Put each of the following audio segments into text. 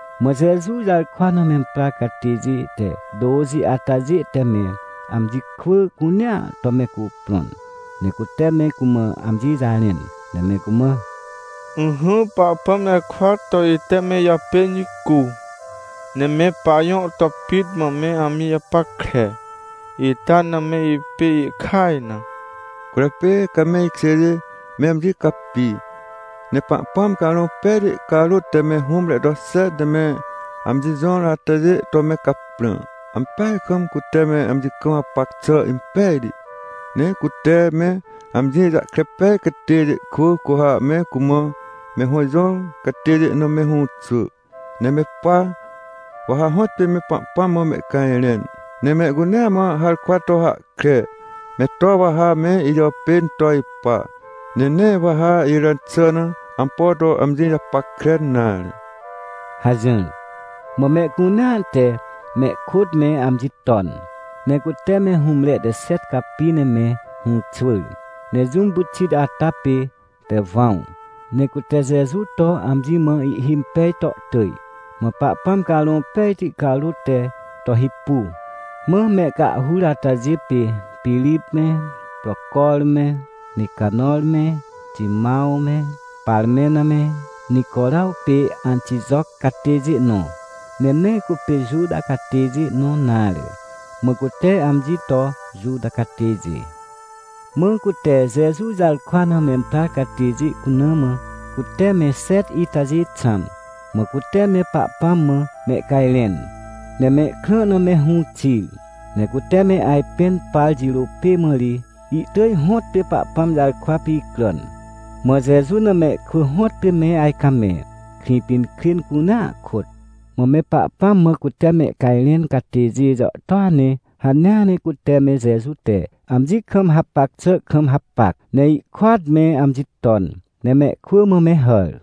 Mã Jeju jarkwa na memprar catêjê te tôxi atajê te me amji kwỳ cunea to me cuprõn, ne cute me cumã amji jarẽn, ne me cumã: — Ỹhỹ Pahpãm jarkwa to ite me ijàpên jicu, ne me pajõ to pit mã me amji japackre, ita na me ipê ihkaj na. Cwỳrjapê, ca me ikjêjê me amji capi, ne Pahpãm Carõ Pejti carôt te me hũmre to xet ne me amji jõr atajê to me caprã. Ampeaj kam cute me amji kam hapac xà impejti, ne cute me amji jahkre pej catêjê kwỳ cu ha me cumã me hõ jõr catêjê na me hũxwỳ. Ne me pa, wa ha hõtpê me Pahpãm mã mehcajrẽn, ne mehcunea mã harkwa to hahkre me to wa ha me ijàpên to ipa, ne nee wa ha iràn xà na ampo to amji japackre nare — hajỹr. Mã mehcunea te mehkôt me amji ton, ne cute me hũmre te xet capi ne me hũxwỳr. Ne jũm pyxit ata pê Tewãw, ne cute Jeju to amji mã ihhimpej to tỳj, mã Pahpãm Carõ Pejti carôt te to hipu. Mã mehcahhur atajê pê Pirip me, Procor me, Nicanõr me, Timãw me, Parmena me, Nicoraw pê Antijoc catêjê nõ, ne nee cupê Juta catêjê nõ nare, mã cute amji to Juta catêjê. Mã cute Jeju jarkwa na memprar catêjê cuna mã, cute me xet itajê xãm. Mã cute me Pahpãm mã mehcajrẽn, ne mehkrã na me hũ xir. Ne cute me ajpẽn par jirô pê mã ri, ihtỳj hõtpê Pahpãm jarkwa picràn. Mã Jeju na mehkwỳ hõtpê me ajcamẽ, Krĩpinkrên cunea kôt. Mã me Pahpãm mã cute mehcajrẽn catêjê jàhtôa ne hanea ne cute me Jeju te amji kam hapac xà kam hapac, ne ihkôat me amji ton, ne mehkwỳ mã me hàr.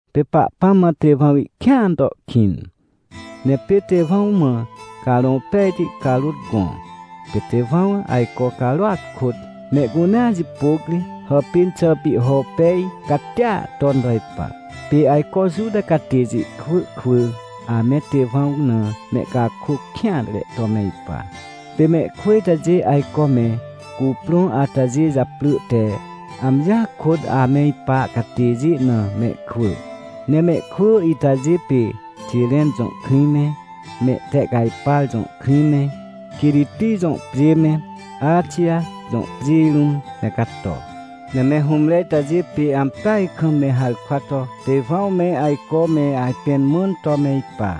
Pê Pahpãm mã Tewãw ihkĩan to ihkĩn. Ne pê Tewãw mã Carõ Pejti carôt gõ, pê Tewãw ajco carôat kôt mehcunea jipôc ri hàpên xà pihho impej catia ton to ipa. Pê ajco Juta catêjê kwỳ kwỳ ame Tewãw na mehcakôc kêanre to me ipa. Pê mehkwỳ itajê ajco me cuprõ atajê japrỳ te “Amjia kôt ame ipa catêjê na mehkwỳ”. Ne mehkwỳ itajê pê Xiren jõ krĩ me, Mehtehcajpar jõ krĩ me, Quiriti jõ pjê me, Axij jõ pjê rũm me cato. Ne me hũmre itajê pê ampeaj kam me harkwa to Tewãw me ajco me ajpẽn mãn to me ipa.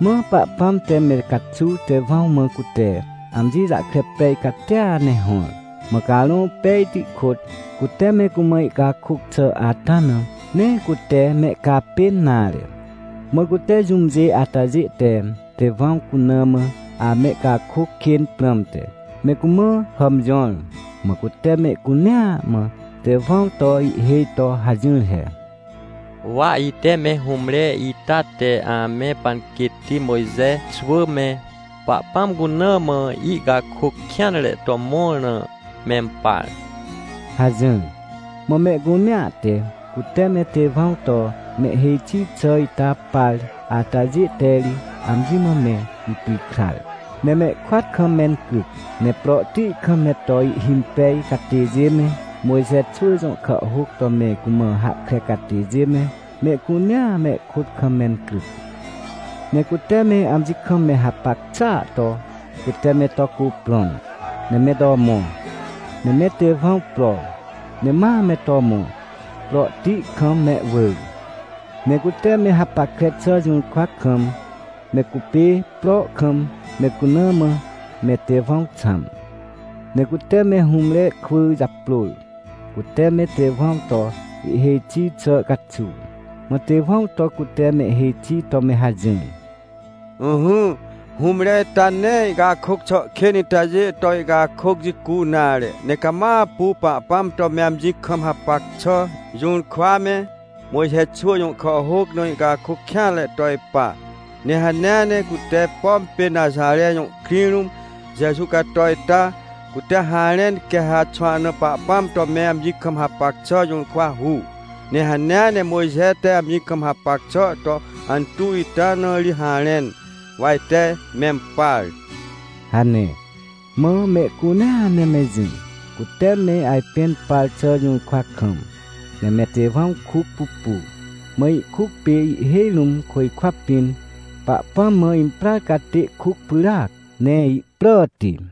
Mã Pahpãm te me caxuw Tewãw mã cute amji jahkre pej catia ne hõr, mã Carõ Pejti kôt cute me cumã ihcakôc xà ata na nee cute mehcapên nare. Mã cute, jũmjê atajê te Tewãw cuna mã amehcakôc kên prãmte, me cumã hàmjõr. Mã cute mehcunea mã Tewãw to ihhêj to hajỹr he: — Wa ite me hũmre ita te ame panquêtti Mojxe xwỳ me, Pahpãm cuna mã ihcakôc kêanre to mõr na mempar — hajỹr. Mã mehcunea te, cute me Tewãw to mehhêj xi xà ita par atajê te ri amji mã me ipikrar, ne mehkôat kam mencryc. Ne prohti kam me to ihhimpej catêjê me, Mojxe xwỳ jõ kàhhôc to me cumã hahkre catêjê me, mehcunea mehkôt kam mencryc. Ne cute me amji kam me hapac xàa to, cute me to cuprõn, ne me to mõ, ne me Tewãw pro, ne ma me to mõ, prohti kam mehwỳr. Ne cute me hapackre xà jũrkwa kam, me cupê pro kam me cuna mã me Tewãw xãm. Ne cute me hũmre kwỳ japrôr, cute me Tewãw to ihhêj xi xà caxuw. Mã Tewãw to cute mehhêj xi to me hajỹr: — Ỹhỹ, hũmre ita nee ihcakôc xà kên itajê to ihcakôc jicu nare, ne cama apu Pahpãm to me amji kam hapac xà jũrkwa me, Mojxe xwỳ jõ kàhhôc na ihcakôc kêanre to ipa. Ne hanea ne cute, pom pê Naxare jõ krĩ rũm Jeju cato ita, cute harẽn quê ha xwahna Pahpãm to me amji kam hapac xà jũrkwa hu, ne hanea ne Mojxe te amji kam hapac xà to antuw ita na ri harẽn, wa ite mempar — hane. Mã mehcunea ne me jỹ, cute me ajpẽn par xà jũrkwa kam, ne me Tewãw kuc pupu. Mã ihkuc pê ihhêj rũm côjkwa pĩn Pahpãm mã imprar catê kuc pyràac, ne ihpràti.